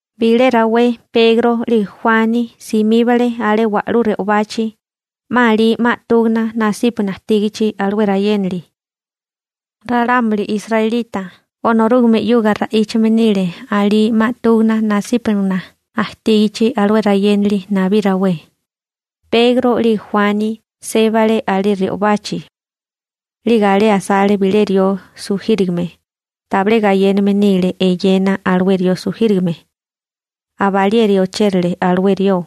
Bilé rawé Pegro 'lige Juani simíbale alé wa'lú re'obachi, 'ma alí 'ma 'túgana nasípagana ajtígichi alué rayénali. Ralámuli israelita Onorúgame 'yuga ra'íchame nile alí 'ma 'túgana nasípagana ajtígichi alué rayénali nabí rawé. Pegro 'lige Juani sébale alé re'obachi. 'Lige alé asale bilé rió sujírigame, tabilé gayéname nile eyena alué rió sujírigame. Abalieri ochérale alué rió.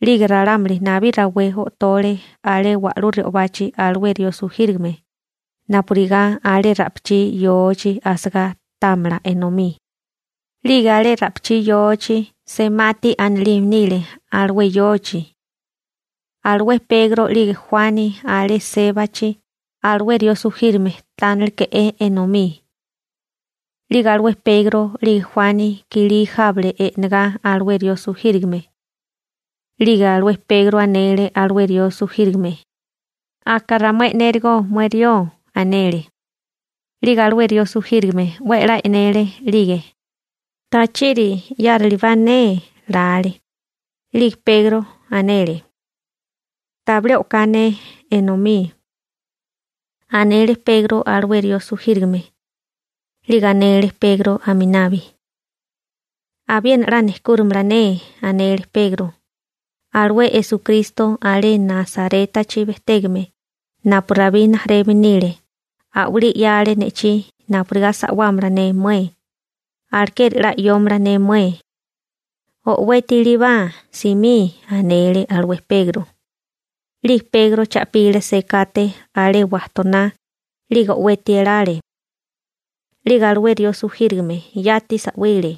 'Lige ralámuli nabí rawé o'tole alé wa'lú re'obachi alué rió sujírigame, napurigá alé ra'pichí yochi asagá támala enomí. 'Lige alé alué ra'pichí yochi «Semati» anilime nile alué yochi. Alué Pegro 'lige Juani alé sébachi, alué rió sujírigame táneleke'é enomí. 'Lige alué Pegro 'lige Juani kilí jábale e'negá alué rió sujírigame. 'Lige alué Pegro anele alué rió sujírigame: ―Aka ramué e'nérigo mué rió ―anele. 'Lige alué rió sujírigame 'we a'lá e'nele 'lige: «¿Tachiri 'yárilibá ne?» lale. 'Lige Pegro anele: ―Tabilé o'ká ne enomí ―anele Pegro alué rió sujírigame. 'Lige anele Pegro aminabi: ―Abiena 'la nejkúrimala ne. Alué Esukristo alé Nasarétachi bejtégame napu Rabí rijimala nile a'walí 'yale ne'chí napurigá sa'wámala ne mué. Alekeri 'la 'yómala ne mué. O'weti ilíbá, simí ―anele alué Pegro. 'Lige Pegro cha'pile sekate alé wajtoná, 'lige o'weti elale. 'Lige alué rió sujírigame yati sa'wile.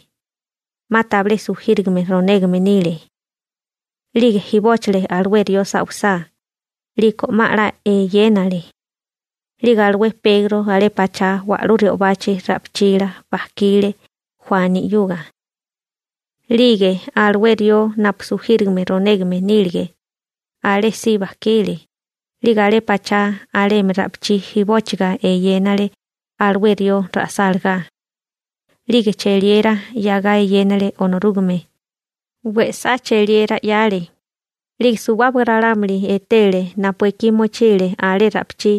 'Ma tabilé sujírigame ronégame nile. 'Lige jibóchile alué rió sa'wisá, 'liko 'ma 'la eyénale. 'Lige alué Pegro alé pachá wa'lú re'obá ra'pichila bajkile Juani 'yuga. 'Lige alué rió napu sujírigame ronégame nílige, alé si bajkile, 'lige alé pachá alemi ra'pichí jibóchiga eyénale alué rió ra'sálagá. 'Lige cheliera 'yagá eyénale Onorúgame, we'sá cheliera 'yale. 'Lige suwábaga ralámuli etele napu ekí mochile alé ra'pichí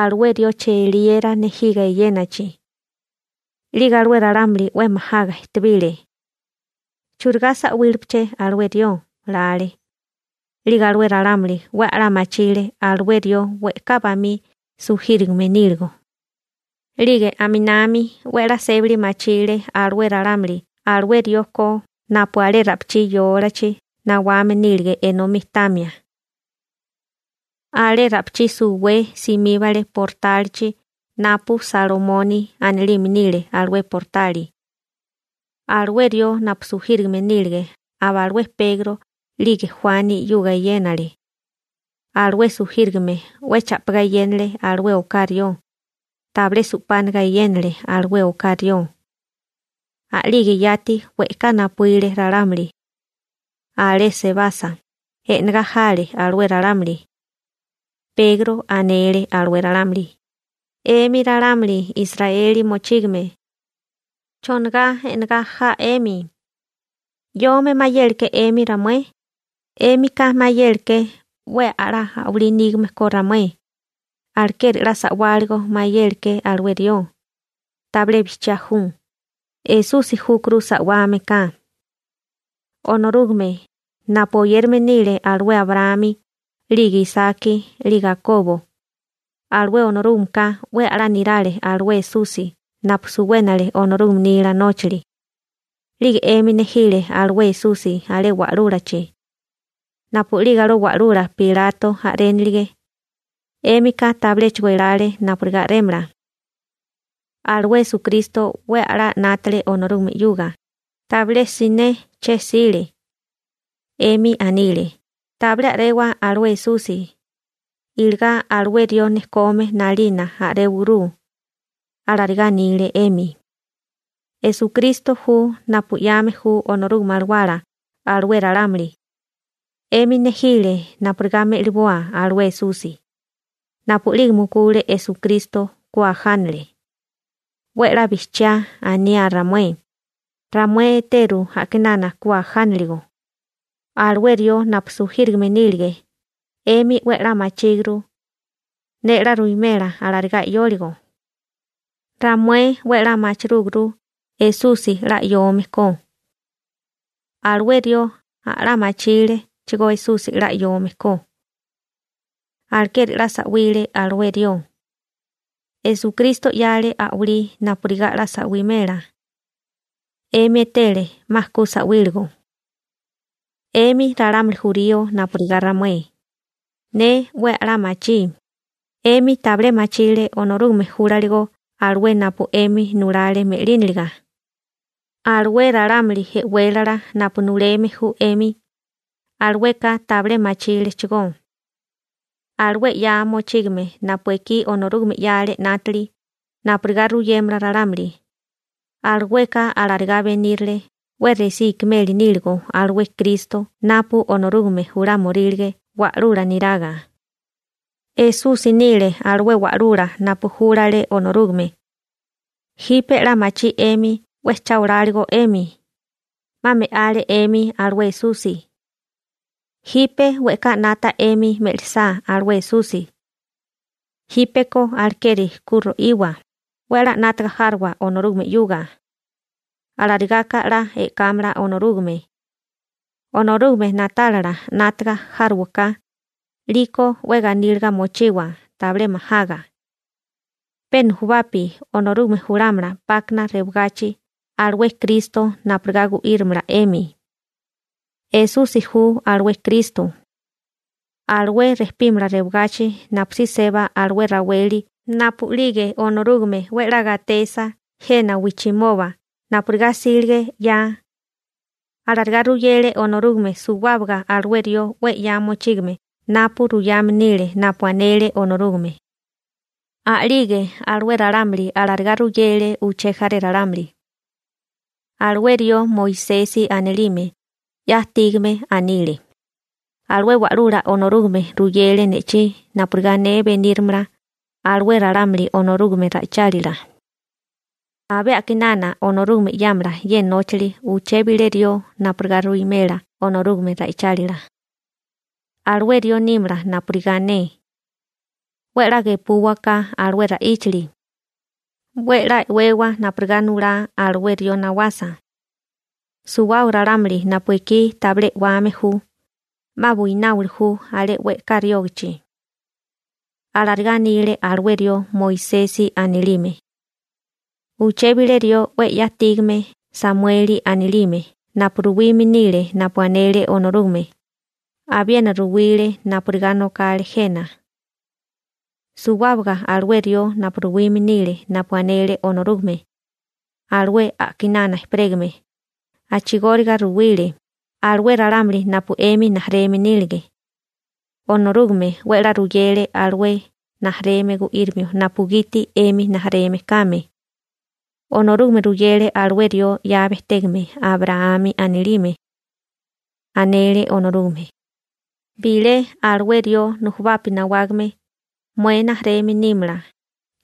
alué rió cheliera nejiga eyénachi. 'Lige alué ralámuli 'we majaga ejtebile. «¿Churigá sa'wílepeché alué rió?», lale. 'Lige alué ralámuli 'we a'lá machile alué rió we'ká bamí sujírigame níligo. 'Lige aminami 'we a'lá sébali machile alué ralámuli alué rió ko napu alé ra'pichí yólachi nawame nílige enomí tamia. Alé ra'pichí suwé simíbale portálichi napu «Salomoni» anilime nile alué portali. Alué rió napu sujírigame nílige aba alué Pegro 'lige Juani 'yuga eyénale. Alué sujírigame 'we cha'pigá eyénale alué oká rió, tabilé su'pániga eyénale alué oká rió. A'lige yati we'ká napuíle ralámuli. Alé sebasa, e'negá jale alué ralámuli. Pegro anele alué ralámuli: ―'Emi ralámuli Israeli mochígame. ¿Chonigá e'negá ja 'emi? ¿'Yome mayéleké 'emi ramué? 'Émika mayéleké 'we a'lá a'walí nígame ko ramué, alekeri 'la sa'wáligo mayéleké alué rió. Tabilé bijchiá ju. Esusi júkuru sa'wame ka. Onorúgame, napu oyérame nile alué Abraámi, 'lige Isaki 'lige Akobo, alué Onorúgameka 'we a'lá nirale alué Esusi napu suwénale Onorúgame nila nóchali, 'lige 'emi nejile alué Esusi alé wa'lúlachi. Napu'lige alué wa'lula Pilato sulíchi napurigá tabilé me'liboa, 'émika tabiléchigo elálekó napurigá a'rémala, napurigá tabilé me'liboa. Alué Esukristo 'we a'lá 'nátale Onorúgame 'yuga, tabilé siné che'sile. 'Emi anile: «Tabilé a'rewa alué Esusi. Iligá alué rió nejkome 'nalina a'réwaguru.» Alarigá anile 'emi. Esukristo ju napu 'yame ju Onorúgame Alawala alué ralámuli. 'Emi nejile napurigá me'liboa alué Esusi. Napu'lige mukule Esukristo, ku ajánale. 'We 'la bijchiá aniá ramué. Ramué eteru a'kinana ku ajániligo. Alué rió napu sujírigame nílige, 'emi 'we 'la machíguru. Ne 'la ruwimela alarigá 'yóligo. Ramué 'we a'lá machirúguru Esusi 'la 'yome ko. Alué rió a'lá machílechigó Esusi 'la 'yome ko. Alekeri 'la sa'wile alué rió. Esukristo 'yale a'walí napurigá 'la sa'wimela. 'Emi etele 'ma ku sa'wíligo. › 'Emi ralámuli jurío napurigá ramué, ne 'we a'lá machí: 'emi tabilé machile Onorúgame júlaligo alué napu 'emi nulale me'líniliga. Alué ralámuli e'wélala napu nuleme ju 'emi, alueka tabilé machílechigó. Alué 'ya mochígame napu ekí Onorúgame 'yale 'nátili napurigá ruyémala ralámuli, alueka alarigá benírale 'we resí ikimeli níligo alué Kristo napu Onorúgame julámorílige wa'lula niraga. Esusi nile alué wa'lula napu júlale Onorúgame. Jipe 'la machí 'emi 'we cha oláligo 'emi, 'ma me'ale 'emi alué Esusi. Jipe we'ká 'nata 'emi me'lisá alué Esusi. Jípeko alekeri ku ro'iwa, 'we a'lá 'nátaga járowa Onorúgame 'yuga. Alarigaka 'la e'kámala Onorúgame. Onorúgame na'tálala 'nátaga járowaká, 'liko 'we ganíliga mochiwa, tabilé majaga. Pe nujubapi Onorúgame julámala 'pákana rewagachi alué Kristo napurigá gu'írimala 'emi. Esusi ju alué Kristo. Alué rejpímala rewagachi napusí seba alué raweli napu'lige Onorúgame 'we 'la gatesa jena wijchimoba napurigá 'sílige 'ya. Alarigá ruyele Onorúgame suwábaga alué rió 'we 'ya mochígame napu ruyame nile napu anele Onorúgame. A'lige alué ralámuli alarigá ruyele uché jaré ralámuli. Alué rió Moisesi anilime 'ya ajtígame anile: «Alué Wa'lula Onorúgame ruyele ne'chí napurigá ne benírimala alué ralámuli Onorúgame ra'ichálila. Abé a'kinana Onorúgame 'yámala ye nóchali uché bilé rió napurigá ruwimela Onorúgame ra'ichálila. Alué rió nímala napurigá ne. 'We 'la gepúwaká alué ra'íchali. 'We 'la e'wewa napurigá nulá alué rió nawasa. Suwábaga ralámuli napu ekí tabilé e'wame ju, 'ma buináwili ju alé we'ká riógachi.» Alarigá anile alué rió Moisesi anilime. › Uché bilé rió 'we 'ya ajtígame Samueli anilime napu ruwime nile napu anele Onorúgame, abiena ruwile napurigá nokale jena. Suwábaga alué rió napu ruwime nile napu anele Onorúgame, alué a'kinana ejperégame, a'chigóriga ruwile, alué ralámuli napu 'emi rijimala nílige. Onorúgame 'we a'lá ruyele alué rijimala gu'írimio napugiti 'emi rijimala kame. Onorúgame ruyele alué rió 'ya bejtégame Abraámi anilime. Anele Onorúgame: «Bilé alué rió nujubapi nawágame, mué rijimala nímala,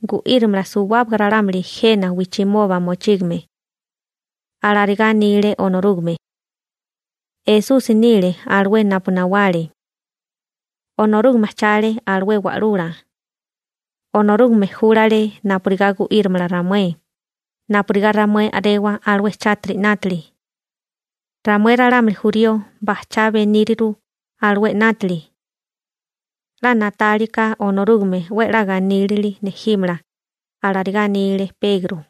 gu'írimala suwábaga ralámuli jena wijchimoba mochígame.» Alarigá anile Onorúgame. Esusi nile alué napu nawale. Onorúgame ajchale alué wa'lula. Onorúgame júlale napurigá gu'írimala ramué, napurigá ramué a'rewa alué chátiri 'nátili. Ramué ralámuli jurío bajchá beníriru alué 'nátili. 'La na'talia ka Onorúgame 'we 'la ganílili nejímala ―alarigá anile Pegro.